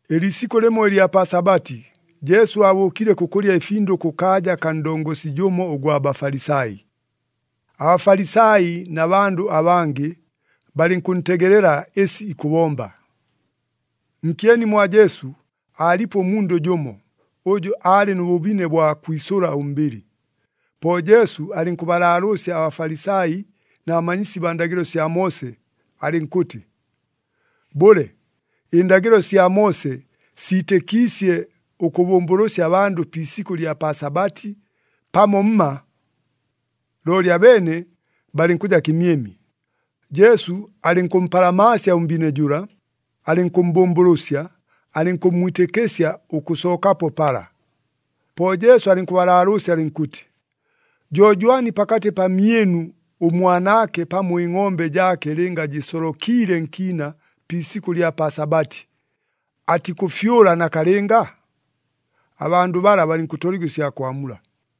Ɨliisikʉ lɨmo ɨlya pa Sabati, Jesu aabʉʉkile kʉkʉlya ɨfindʉ kʉkaaja kaa ndongosi jʉmo ʉgwa Bafalisai. ABafalisai na bandʉ abangɨ, balɨnkʉntegelela ɨsi ikʉbomba. Nkyeni mwa Jesu, aalipo ʉmundʉ jʉmo, ʉjʉ aalɨ nʉ bʉbine bwa kwisʉla ʉmbɨlɨ. Po Jesu alɨnkʉbalaalʉʉsya aBafalisai na bamanyisi baa ndagɨlo sya Moose, alɨnkʉtɨ, “Bʉle, ɨndagɨlo sya Moose siitɨkiisye ʉkʉbʉmbʉlʉsya abandʉ pi isikʉ ɨlya pa Sabati, pamo mma?” Looli abeene balɨnkʉja kɨmyemye. Jesu alɨnkʉmpalamaasya ʉmbine jʉla, alɨnkʉmmbʉmbʉlʉsya, alɨnkʉmmwitɨkɨsya ʉkʉsookapo pala. Po Jesu alɨnkʉbalaalʉʉsya alɨnkʉtɨ, “Jo jwani pakatɨ pamyɨnu, ʉmwanaake pamo ɨngʼombe jaake lɨnga jɨsolokiile nkiina pi isikʉ ɨlya pa Sabati, atikʉfyʉla nakalɨnga?” Abandʉ bala balɨnkʉtoligwa ɨsya kwamula.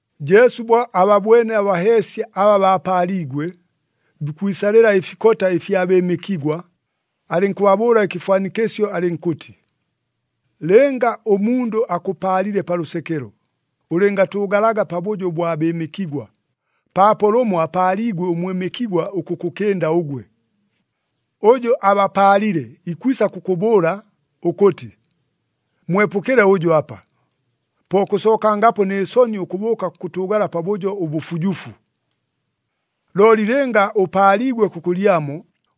Jesu bo ababwene abaheesya aba baapaaliigwe, bikwisalɨla ɨfikota ɨfya bɨɨmɨkigwa, alɨnkʉbabʉʉla ɨkɨfwanikɨsyo alɨnkʉtɨ, “Lɨnga ʉmundʉ akʉpaalile pa lʉsekelo, ʉlɨngatʉʉgalaga pabʉjo ʉbwa bɨɨmɨkigwa, paapo lʉmo apaaliigwe ʉmwɨmɨkigwa ʉkʉkʉkɨnda ʉgwe. Ʉjʉ abapaalile ikwisa kʉkʉbʉʉla ʉkʉtɨ, ‘Mwepʉkɨle ʉjʉ apa.’ Po kʉsookangapo nɨ soni ʉkʉbʉʉka kʉkʉtʉʉgala pabʉjo ʉbʉfujufu. “Looli lɨnga ʉpaaliigwe kʉkʉlyamo,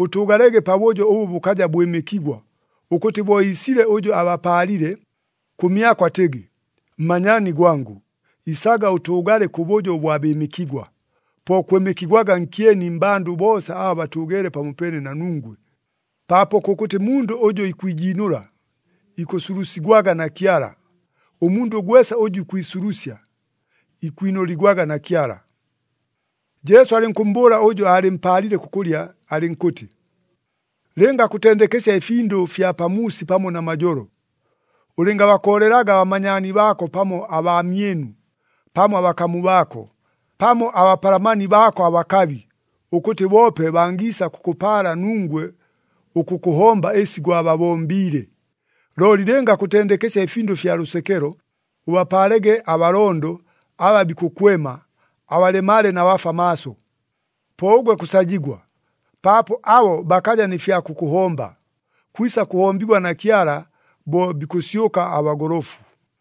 ʉtʉʉgalege pabʉjo ʉbʉ bʉkaja bwɨmɨkigwa, ʉkʉtɨ bo iisile ʉjʉ abapaalile, kʉmyako atɨgɨ, ‘Mmanyaani gwangʉ, isaga ʉtʉʉgale kʉbʉjo ʉbwa bɨɨmɨkigwa.’ Po kwɨmɨkigwaga nkyeni mmbandʉ boosa aba batʉʉgeele pamopeene na nungwe. Paapo kʉkʉtɨ mundʉ ʉjʉ ikwijiinʉla, ikʉsulusigwaga na Kyala, ʉmundʉ gwesa ʉjʉ ikwisulusya, ikwinʉligwaga na Kyala.” Jesu alɨnkʉmmbʉʉla ʉjʉ aalɨmpaalile kʉkʉlya alɨnkʉtɨ, “Lɨnga kʉtendekesya ɨfindʉ fya pamuusi pamo namajolo, ʉlɨngabakoolelaga abamanyaani baako pamo abaamyɨnu, pamo abakamu baako, pamo abapalamani baako abakabi, ʉkʉtɨ boope bangiisa kʉkʉpaala nungwe ʉkʉkʉhomba ɨsi gwababombiile. Looli lɨnga kʉtendekesya ɨfindʉ fya lʉsekelo, ʉbapaalege abalondo, aba bikʉkwema, abalemale na bafwa maaso. Po ʉgwe kʉsajigwa, paapo abo bakaja nɨ fya kʉkʉhomba. Kwisa kʉhombigwa na Kyala bo bikʉsyʉka abagolofu.”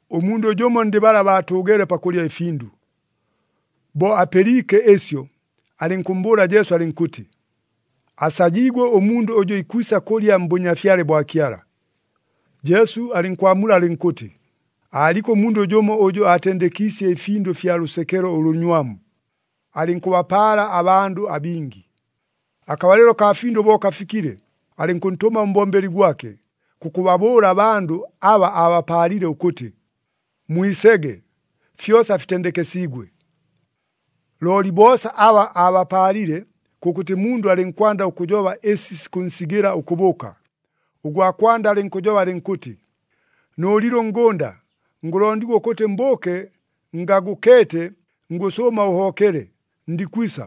Ʉmundʉ jʉmo ndɨ bala baatʉʉgeele pakʉlya ɨfindʉ, bo apɨliike ɨsyo, alɨnkʉmmbʉʉla Jesu alɨnkʉtɨ, “Asajiigwe ʉmundʉ ʉjʉ ikwisa kʉlya mBʉnyafyale bwa Kyala!” Jesu alɨnkwamula alɨnkʉtɨ, “Aaliko ʉmundʉ jʉmo ʉjʉ aatendekiisye ɨfindʉ fya lʉsekelo ʉlʉnywamu, alɨnkʉbapaala abandʉ abingi. Akabalɨlo kaa findʉ bo kafikile, alɨnkʉntʉma ʉmbombeli gwake, kʉkʉbabʉʉla abandʉ aba aabapaalile ʉkʉtɨ, ‘Mwisege, fyosa fitendekesiigwe!’ “Looli boosa aba aabapaalile, kʉkʉtɨ mundʉ alɨnkwanda ʉkʉjoba ɨsi sikʉnsigɨla ʉkʉbʉʉka. Ʉgwa kwanda alɨnkʉjoba alɨnkʉtɨ, ‘Nʉʉlile ʉngʉnda, ngʉlondigwa ʉkʉtɨ mbʉʉke ngagʉkeete, ngʉsʉʉma ʉhobokele, ndikwisa.’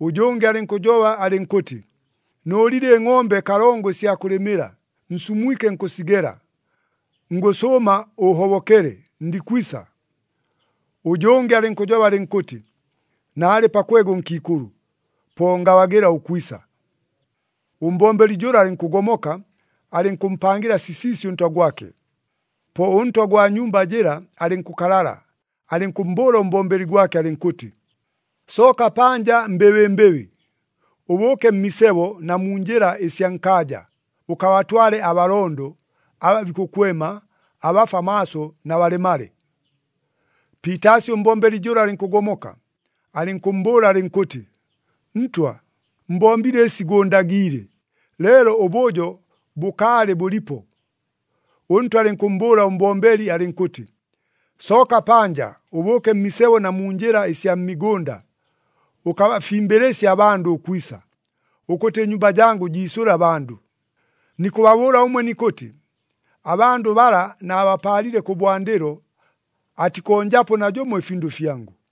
Ʉjʉngɨ alɨnkʉjoba alɨnkʉtɨ, ‘Nʉʉlile ɨngʼombe kalongo ɨsya kʉlɨmɨla, nsumwike nkʉsigela, ngʉsʉʉma ʉhobokele, ndikwisa.’ Ʉjʉngɨ alɨnkʉjoba alɨnkʉtɨ, ‘Naalɨ pakwega ʉnkiikʉlʉ, po ngabagɨla ʉkwisa.’ “Ʉmbombeli jʉla alɨnkʉgomoka, alɨnkʉmpangɨla sisiisi ʉntwa gwake. Po ʉntwa gwa nyumba jɨla alɨnkʉkalala, alɨnkʉmmbʉʉla ʉmbombeli gwake alɨnkʉtɨ, ‘Sooka panja mbɨbɨmbɨbɨ, ʉbʉʉke mmisebo na mu njɨla ɨsya nkaaja, ʉkabatwale abalondo, aba bikʉkwema, abafwa maaso na balemale.’ “Piitaasi ʉmbombeli jʉla alɨnkʉgomoka, alɨnkʉmmbʉʉla alɨnkʉtɨ, ‘Ntwa, mbombile ɨsi gʉʉndagiile, leelo ʉbʉjo bʉkaalɨ bʉlipo.’ “Ʉntwa alɨnkʉmmbʉʉla ʉmbombeli alɨnkʉtɨ, ‘Sooka panja, ʉbʉʉke mmisebo na mu njɨla ɨsya mmigʉnda, ʉkabafimbɨlɨsye abandʉ ʉkwisa, ʉkʉtɨ ɨnyumba jangʉ jiisʉle abandʉ. Nikʉbabʉʉla ʉmwe nikʉtɨ, abandʉ bala naabapaalile kʉbwandɨlo, atikonjapo najʉmo ɨfindʉ fyangʉ!’”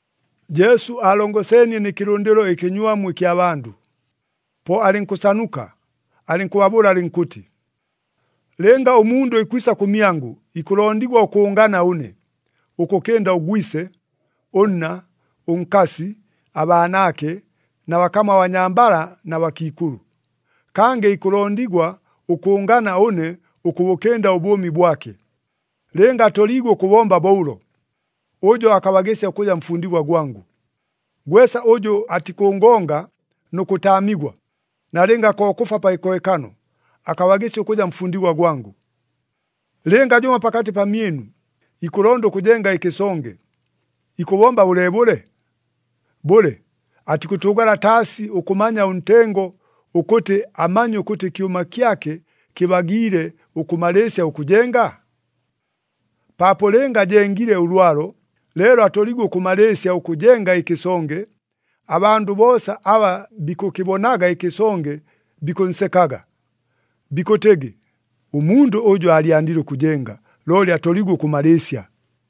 Jesu aalongeseenie nɨ kɨlʉndɨlo ɨkɨnywamu ɨkya bandʉ. Po alɨnkʉsanuka, alɨnkʉbabʉʉla alɨnkʉtɨ, “Lɨnga ʉmundʉ ikwisa kʉmyangʉ, ikʉlondigwa ʉkʉʉngana ʉne, ʉkʉkɨnda ʉgwise, ʉnna, ʉnkasi, abaanaake, na bakamu abanyambala na bakiikʉlʉ. Kangɨ ikʉlondigwa ʉkʉʉngana ʉne ʉkʉbʉkɨnda ʉbʉʉmi bwake. Lɨnga atoliigwe ʉkʉbomba bo ʉlo, ʉjo akabagɨsya ʉkʉja mfundigwa gwangʉ. Gwesa ʉjʉ atikʉngonga nʉ kʉtaamigwa, nalɨnga ko kʉfwa pa kɨkohekano, akabagɨsya ʉkʉja mfundigwa gwangʉ. “Lɨnga jʉmo pakatɨ pamyɨnu, ikʉlonda ʉkʉjenga ɨkɨsonge, ikʉbomba bʉleebʉle? Bʉle, atikʉtʉʉgala taasi ʉkʉmanya ʉntengo, ʉkʉtɨ amanye ʉkʉtɨ ɨkyʉma kyake kɨbagiile ʉkʉmalɨɨsya ʉkʉjenga? Paapo lɨnga ajengile ʉlwalo, leelo atoliigwe ʉkʉmalɨɨsya ʉkʉjenga ɨkɨsonge, abandʉ boosa aba bikʉkɨbonaga ɨkɨsonge bikʉnsekaga. Bikʉtɨgɨ, ‘Ʉmundʉ ʉjʉ aalyandile ʉkʉjenga, looli atoliigwe ʉkʉmalɨɨsya!’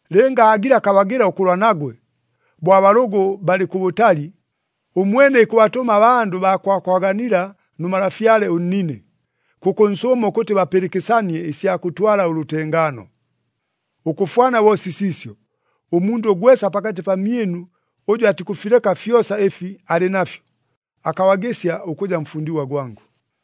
Lɨnga aagile akabagɨla ʉkʉlwa nagwe, bo abalʉgʉ balɨ kʉbʉtali, ʉmwene ikʉbatʉma abandʉ baa kwakwaganila nʉ malafyale ʉnnine, kʉkʉnsʉʉma ʉkʉtɨ bapɨlɨkɨsanie ɨsya kʉtwala ʉlʉtengaano. “Ʉkʉfwana bo sisiisyo, ʉmundʉ gwesa pakatɨ pamyɨnu ʉjʉ atikʉfileka fyosa ɨfi alɨ nafyo, akabagɨsya ʉkʉja mfundigwa gwangʉ.”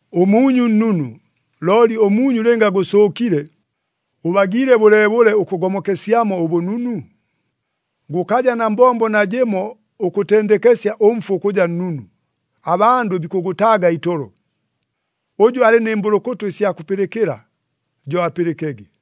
“Ʉmuunyu nnunu, looli ʉmuunyu lɨnga gʉsʉʉkile, ʉbagiile bʉleebʉle ʉkʉgomokesyamo ʉbʉnunu? Gʉkaja na mbombo najɨmo ʉkʉtendekesya ʉmfu ʉkʉja nnunu, abandʉ bikʉgʉtaaga itolo. Ʉjʉ alɨ nɨ mbʉlʉkʉtʉ ɨsya kʉpɨlɨkɨla, jo apɨlɨkege!”